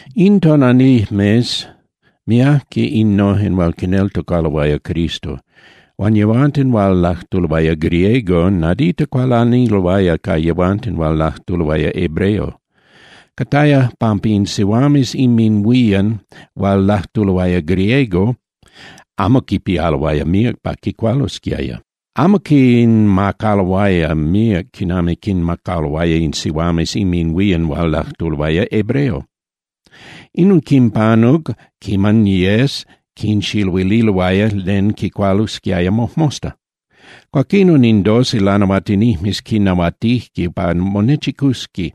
In tonalijmes miajque innojen hual quineltocaloaya Cristo. Huan yehuanten hual lajtuloaya griego nadita cualaniloaya ca yehuanten hual lajtuloaya hebreo. Cataya pampa in sihuames inminhuían hual lajtuloaya griego amo quipialoaya míac pa quicualosquiaya. Amo quinmacaloaya míac quinami quinmacaloaya in sihuames inminhuían hual lajtuloaya hebreo. Inon quinpanuc quiman yes quinxiluililoaya len quicualosquiaya mojmosta. Cuaquinon in doce lanahuatinijmes quinahuatijque pa monechicusqui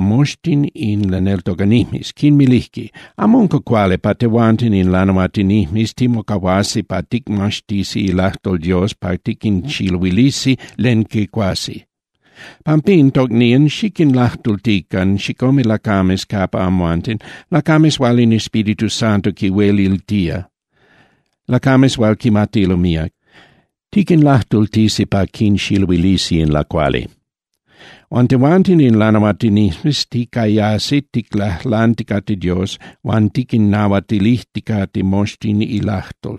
moxtin in laneltocanijmes, quinmilijque: —Amo unca cuali pa tehuanten in lanahuatinijmes timocahuasi pa ticmaxtisi ilajtol Dios pa tiquinxiluilisi len quicuasi. Pampín, tocnían, xiquinlajtultican chicome lacames capa amhuanten, lacames hual in Espíritu Santo quinhueliltía, lacames hual quimatilo míac. Tiquinlajtultisi pa quinxiluilisi in lacuali. Huan tehuanten in lanahuatinijmes ticayasi ticlajlanticate Dios huan tiquinnahuatilijticate moxtin ilajtol.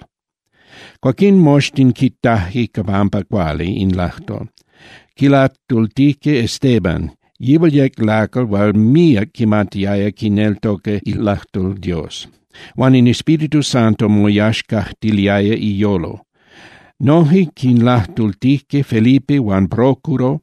Cuaquín moxtin quitajque pampa cuali in lajtol. Quilajtultijque Estéban, yihual yec lacal hual míac quimatiaya quineltoca ilajtol Dios, huan in Espíritu Santo moyaxcajtiliaya iyolo. Noje quinlajtultijque Felipe huan Prócoro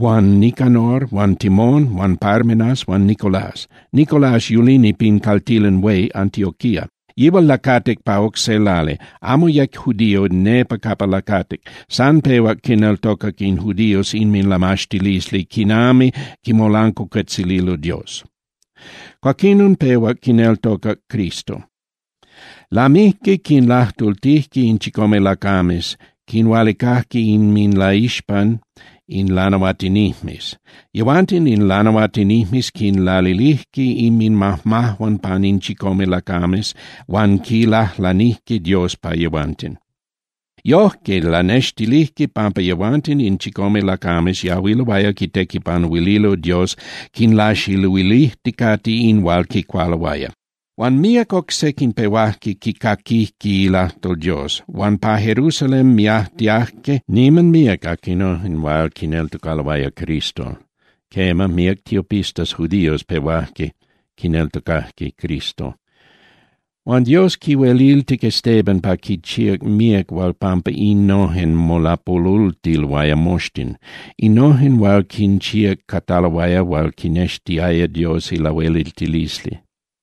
huan Nicanor huan Timón huan Parmenas huan Nicolás. (Nicolás yulini pin caltilan hué Antioquía. Yihual lacatic pa oc se lali, amo yec judío nepa capa lacatic, san pehuac quineltocac in judíos inminlamaxtilisli quinami quimolancuacuetzililo Dios. Cuaquinon pehuac quineltocac Cristo.) Lamijque quinlajtultijque in chicome lacames, quinhualicajque inminlaixpan in lanahuatinijmes. Yehuanten in lanahuatinijmes quinlalilijque inminmajmajuan pan in chicome lacames huan quilajlanijque Dios pa yehuanten. Yojque lanextilijque pampa yehuanten in chicome lacames yahuiloaya quitequipanuililo Dios quinlaxiluilijticate in hual quicualoaya. Huan míac oc sequin pehuajque quicaquijque ilajtol Dios, huan pa Jerusalén miajtiajque niman míac aquinojen hual quineltocaloaya Cristo. Quema, míac tiopistas judíos pehuajque quineltocajque Cristo. Huan Dios quihueliltic Estéban pa quinchíac míac hual pampa innojen molapolultiloaya moxtin. Innojen hual quinchíac cataloaya hual quinextiaya Dios ilahueliltilisli.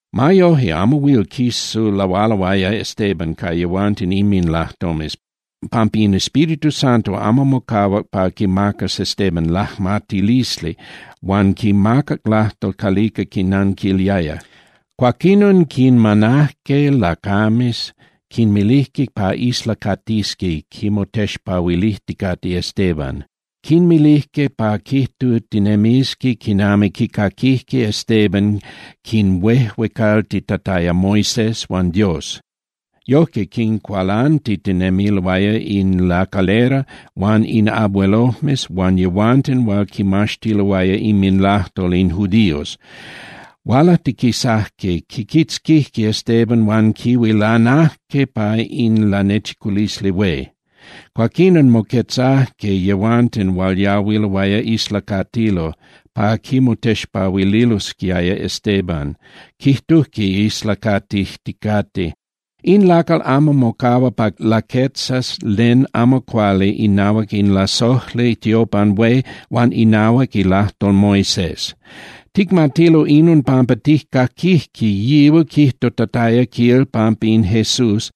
Ma yoje, amo huil quisulahualoaya Estéban ca yehuanten inminlajtomes, pampa in Espíritu Santo amo mocahuac pa quimacas Estéban lajmatilisli huan quimacac lajtol calica quinnanquiliaya. Cuaquinon quinmanajque lacames, quinmilijque pa islacatisqui quimotexpahuilijticate Estéban. Quinmilijque pa quijtutinemisqui quinami quicaquijque Estéban quinhuejuecaltitataya Moisés huan Dios. Yojque quincualantitinemiloaya in lacalera huan in abuelojmes huan yehuanten hual quimaxtiloaya inminlajtol in judíos. Hualajtiquisajque, quiquitzquijque Estéban huan quihuilanajque pa in Lanechiculisli Hué. Cuaquinon moquetzajque yehuanten hual yahuiloaya islacatilo pa quimotexpahuililosquiaya Estéban, quijtujque islaticatijticate: —In lacal amo mocahua pa laquetzas len amo cuali inahuac in lasojli tiopan hué huan inahuac ilajtol Moisés. Ticmatilo inon pampa tijcaquijque yihual quijtutataya, quil, pampa in Jesús,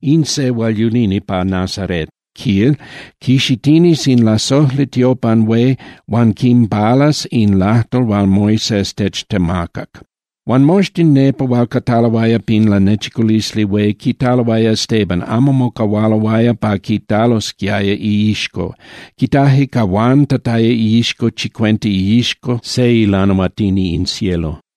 in se hual yulini pa Nazarét, quil, quixitinis in lasojli tiopan hué huan quinpalas in lajtol hual Moisés techtemacac. Huan moxtin nepa hual cataloaya pin Lanechiculisli Hué quitaloaya Estéban, amo mocahualoaya pa quitalosquiaya iixco. Quitajque cahuantataya iixco chicuenta iixco se ilanahuatini in cielo.